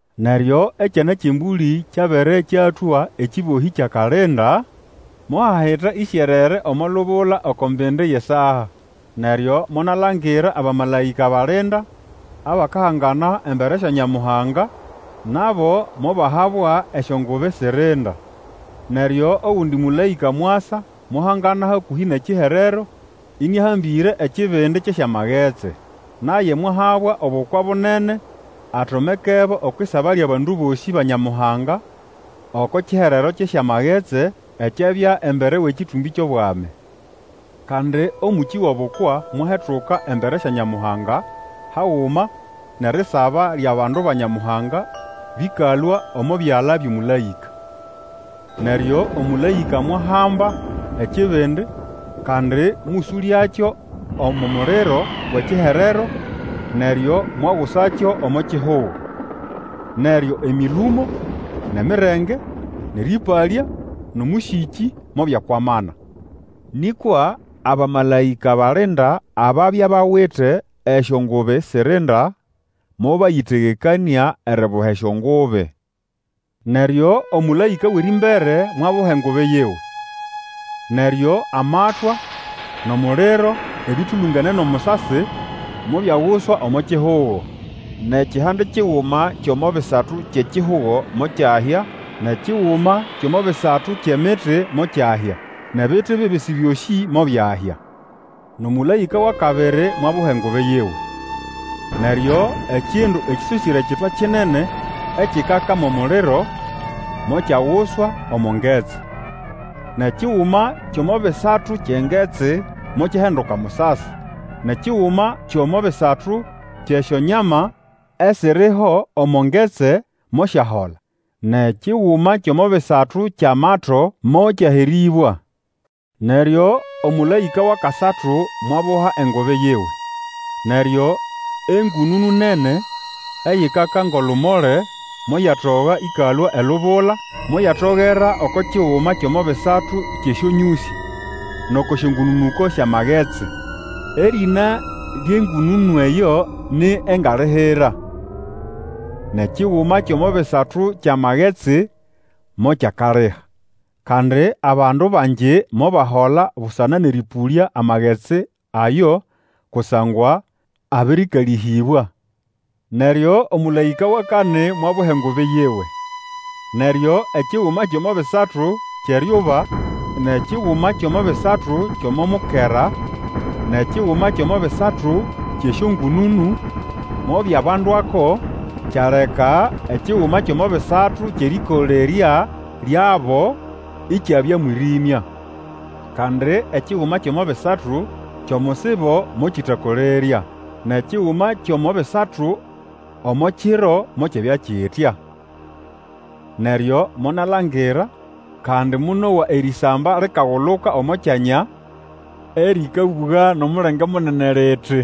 Neryo Ekyana kyʼEmbũlĩ kyabere kyatũa ekĩbohĩ kyʼakalinda, mohahita ĩsyerere omo lubula oko mbindi yʼesaa. Neryo monalangira abamalaĩka balinda abakahangana embere sya Nyamuhanga; nabo mobahabwa esyongubi sirinda. Neryo ogundi mũlaĩka mwasa mwahangana hakũhĩ nʼekiherero ĩnĩahambĩre ekibindi kyʼesyamagetsi. Naye mwahabwa obukwa bunene atomekebo okwʼisaba lyʼabandu bosĩ ba Nyamuhanga oko kiherero kyʼesyamagetsi, ekyabya embere wʼekĩtũmbĩ kyʼobwami. Kandi omũkĩ wʼobukwa mwahetuka embere sya Nyamuhanga haguma nʼerisaba lyʼabandu ba Nyamuhanga bĩkalũa omo byala byʼomũlaĩka. Neryo omũlaĩka mwahamba ekibindi, kandi mũsũlyakyo omo muliro wʼekiherero, neryo mwagusakyo omo kihugo. Neryo emĩlũmo, nʼemirenge, nʼerĩpalya, nʼomũsĩkĩ mobyakwamana. Nĩkwa abamalaĩka balinda ababya bawite esyongubi sirinda mobayĩtegekanĩa eribuha esyongubi. Neryo omũlaĩka wʼerĩmbere mwabuha engubi yiwe. Neryo amatwa nʼomuliro, ĩbĩtũlũngene nʼomusasi, mobyaguswa omo kihugo. Nʼekihande kiguma kyʼomo bisatu kyʼekihugo mokyahya, nʼekiguma kyʼomo bisatu kyʼemiti mokyahya, nʼebiti bibisi byosĩ mobyahya. Nʼomũlaĩka wʼakabiri mwabuha engubi yiwe. Neryo ekindu ekĩsosĩre ekitwa kinene ekikaka mʼomuliro mokyaguswa omo ngetsi. Nʼekiguma kyʼomo bisatu kyʼengetsi mokyahinduka musasi, nʼekiguma kyʼomo bisatu kyʼesyonyama esiriho omo ngetsi, mosyahola; nʼekiguma kyʼomo bisatu kyʼamato mokyaherĩbwa. Neryo omũlaĩka wʼakasatu mwabuha engubi yiwe. Neryo engũnũnũ nene, eyikaka ngʼolumole, moyatoga ĩkalũa elubula, moyatogera oko kiguma kyʼomo bisatu kyʼesyonyũsĩ, nʼoko syongũnũnũko syʼamagetsi. Erĩna lyʼengũnũnũ eyo ni Engalihira. Nʼekiguma kyʼomo bisatu kyʼamagetsi mokyakaliha; kandi abandu bangi mobahola busana nʼerĩpũlya amagetsi ayo, kusangwa abirikalĩhĩbwa. Neryo omũlaĩka wʼakani mwabuha engubi yiwe. Neryo ekiguma kyʼomo bisatu kyʼeryuba, nʼekiguma kyʼomo bisatu kyʼomo mukera, nʼekiguma kyʼomo bisatu kyʼesyongũnũnũ mobyabandwako, kyaleka ekiguma kyʼomo bisatu kyʼerĩkolerya lyabo ikyabya mwĩrĩmya. Kandi ekiguma kyʼomo bisatu kyʼomusibo mokĩtakolerya, nʼekiguma kyʼomo bisatu omo kiro mokyabya kitya. Neryo monalangira, kandi monowa erĩsamba likaguluka omo kyanya, erĩkabũga nʼomulenge munene liti,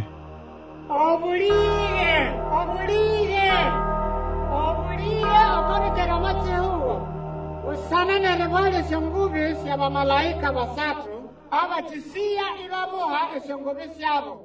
Obũlĩge! Obũlĩge! Obũlĩge oko bĩkere omo kihugo busana nʼeribuha lyʼesyongubi syʼabamalaĩka basatu abakĩsĩya ibabuha esyongubi syabo!